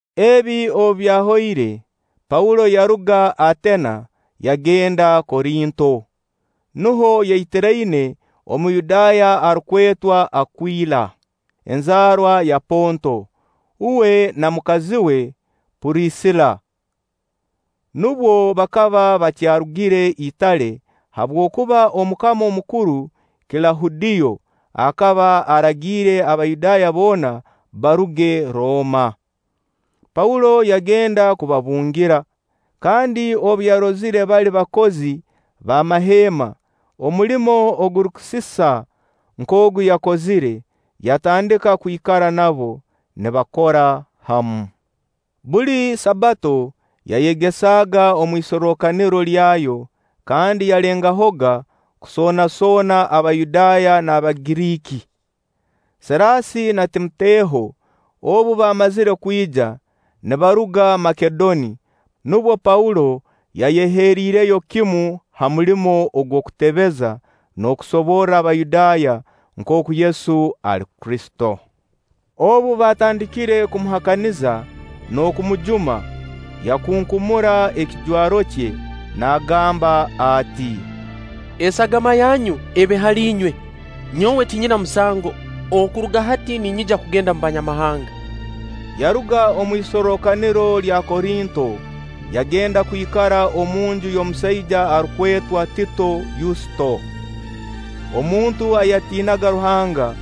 Ebi obu byahoire, Paulo yaruga Ateena yagenda Korinto. Nuho yaitiraine Omuyudaaya arukwetwa Akwila, enzaarwa ya Ponto. Uwe na mukazi we Purisila nubwo bakaba bakyarugire Itale habwokuba Omukama omukuru Kilahudiyo akaba aragiire Abayudaaya boona baruge Rooma. Paulo yagenda kubabungira, kandi obu yarozire bali bakozi b'amaheema, omulimo ogurukusisa nk'ogu yakozire, yatandika kwikara nabo, nibakora hamu. Buli Sabbato yayegesaaga omu isorrokaniro lyayo kandi yalengahoga kusoonasoona Abayudaaya n'Abagiriiki. Siraasi na Timoteho obu baamazire kwija, nibaruga Makedoni, Paulo yayeheriireyo kimu ha mulimo ogw'okutebeza n'okusoborra Abayudaaya nkooku Yesu ali Kristo. Obu baatandikire kumuhakaniza n'okumujuma, yakunkumura ekijwaro kye, naagamba ati: “Esagama yanyu ebe hali inywe. Nyowe tinyina musango. Okuruga hati ninyija kugenda omu Banyamahanga.” Yaruga omu isorrokaniro lya Korinto, yagenda kwikara omunju y'omusaija arukwetwa Tito Yusto, omuntu ayatiinaga Ruhanga.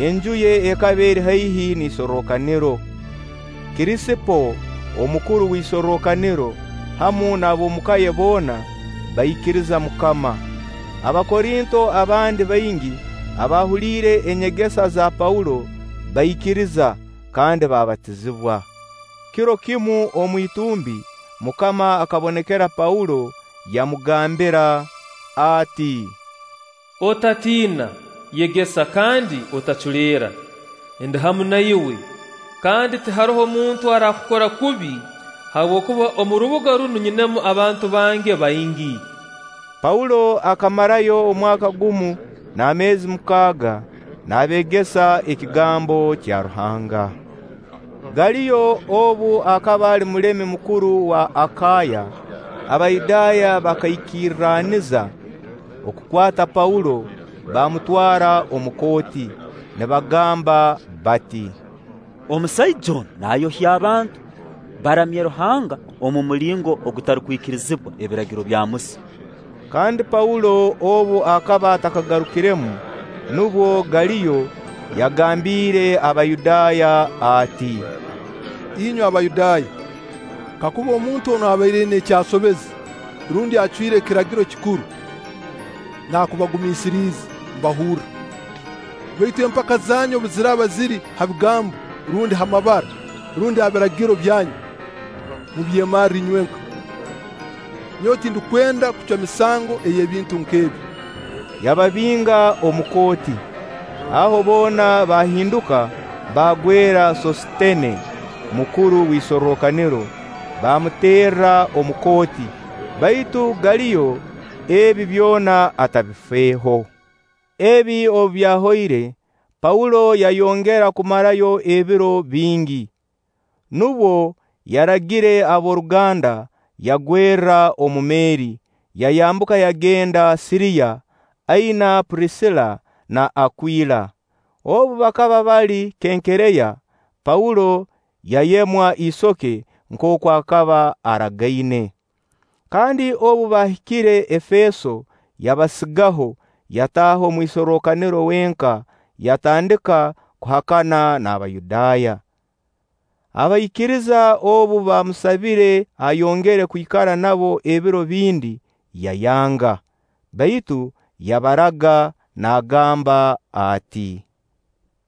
Enju ye ekaba eri haihi n'isorrokaniro. Kirisipo, omukuru w'isorrokaniro, hamu n'ab'omuka ye boona baikiriza MUKAMA. Abakorinto abandi baingi abaahuliire enyegesa za Paulo baikiriza kandi baabatizibwa. Kiro kimu omu itumbi MUKAMA akabonekera Paulo yamugambira ati: “Otatiina, yegesa kandi otaculeera; ndi hamu na iwe, kandi tiharoho muntu araakukora kubi habwokuba omu rubuga runu nyinamu abantu bange baingi.” Paulo akamarayo omwaka gumu n'ameezi mukaaga, naabeegesa ekigambo kya Ruhanga. Galiyo obu akaba ali mulemi mukuru wa Akaaya, Abayudaaya bakaikirraniza okukwata Paulo, baamutwara omu kooti, nibagamba bati: “Omusaija onu naayohya abantu, baramye Ruhanga omu mulingo ogutarukwikirizibwa Ebiragiro bya Musa.” Kandi Paulo obu akaba atakagarukiremu, nubwo Galiyo yagambiire Abayudaaya ati: “Inywe Abayudaaya, kakuba omuntu onu abaire aina eki asobeze, rundi acwire ekiragiro kikuru, naakubagumiisiriize mbahurra; baitu empaka zanyu obu ziraaba ziri ha bigambo, rundi ha mabara, rundi ha biragiro byanyu, mubyemarre inywenka. Nyowe tindukwenda kucwa misango ey'ebintu nk'ebi.” Yababinga omu kooti. Aho boona baahinduka baagwera Soositene, mukuru w'isorrokaniro, baamuterra omu kooti. Baitu Galiyo ebi byona atabifeeho. Ebi obu byahoire, Paulo yayongera kumarayo ebiro bingi, nubwo yaragire ab'oruganda, yagwerra omu meeri, yayambuka yagenda Siriya, aina Purisila na Akwila. Obu bakaba bali Kenkereya, Paulo yayemwa isoke nkooku akaba aragaine. Kandi obu baahikire Efeeso, yabasigaho. Yataaha omu isorrokaniro wenka, yatandika kuhakana n'Abayudaaya. Abaikiriza obu baamusabire ayongere kwikara nabo ebiro bindi, yayanga; baitu yabaraga naagamba ati: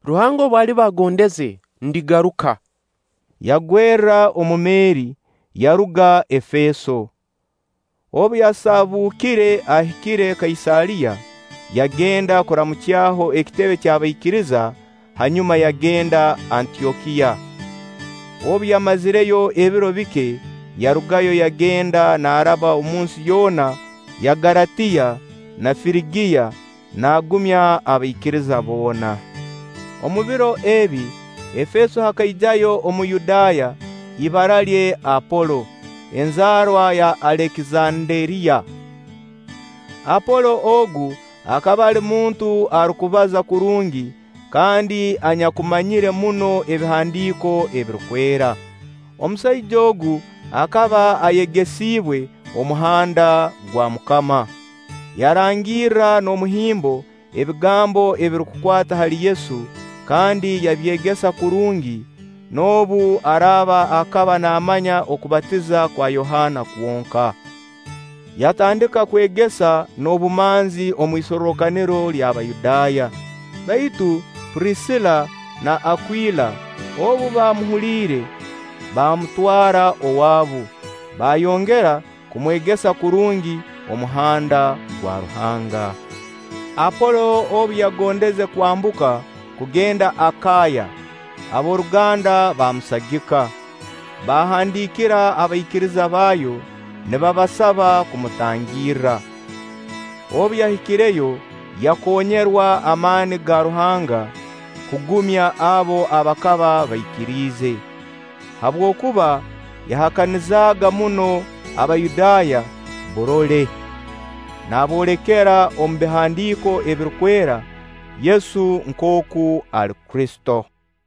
“Ruhanga obu aliba agondeze, ndigaruka.” Yagwerra omu meeri, yaruga Efeeso. Obu yasaabukire ahikire Kaisaariya, yagenda kuramukyaho ekitebe ky'abaikiriza, hanyuma yagenda Antyokiya. Obu yamazireyo ebiro bike, yarugayo, yagenda naaraba omunsi yoona ya Galatiya na Firigiya, naagumya abaikiriza boona. Omu biro ebi, Efeeso hakaijayo Omuyudaaya, ibara lye Apolo, enzaarwa ya Alekizanderiya. Apolo ogu akaba ali muntu arukubaza kurungi kandi anyakumanyire muno Ebihandiiko ebirukwera. Omusaija ogu akaba ayegesiibwe Omuhanda gwa MUKAMA; yarangirra n'omuhimbo ebigambo ebirukukwata hali Yesu kandi yabyegesa kurungi, noobu araaba akaba naamanya okubatiza kwa Yohaana kwonka. Yatandika kwegesa n'obumanzi omu isorrokaniro ly'Abayudaaya; baitu Purisila na Akwila obu baamuhuliire, baamutwara owaabu, baayongera kumwegesa kurungi Omuhanda gwa Ruhanga. Apolo obu yagondeze kwambuka kugenda Akaaya, ab'oruganda baamusagika, baahandiikira abaikiriza baayo nibabasaba kumutangirra. Obu yahikireyo, yakonyerwa amaani ga Ruhanga kugumya abo abakaba baikiriize, habwokuba yahakanizaaga muno Abayudaaya burole, naaboolekera omu Bihandiiko ebirukwera Yesu nkooku ali Kristo.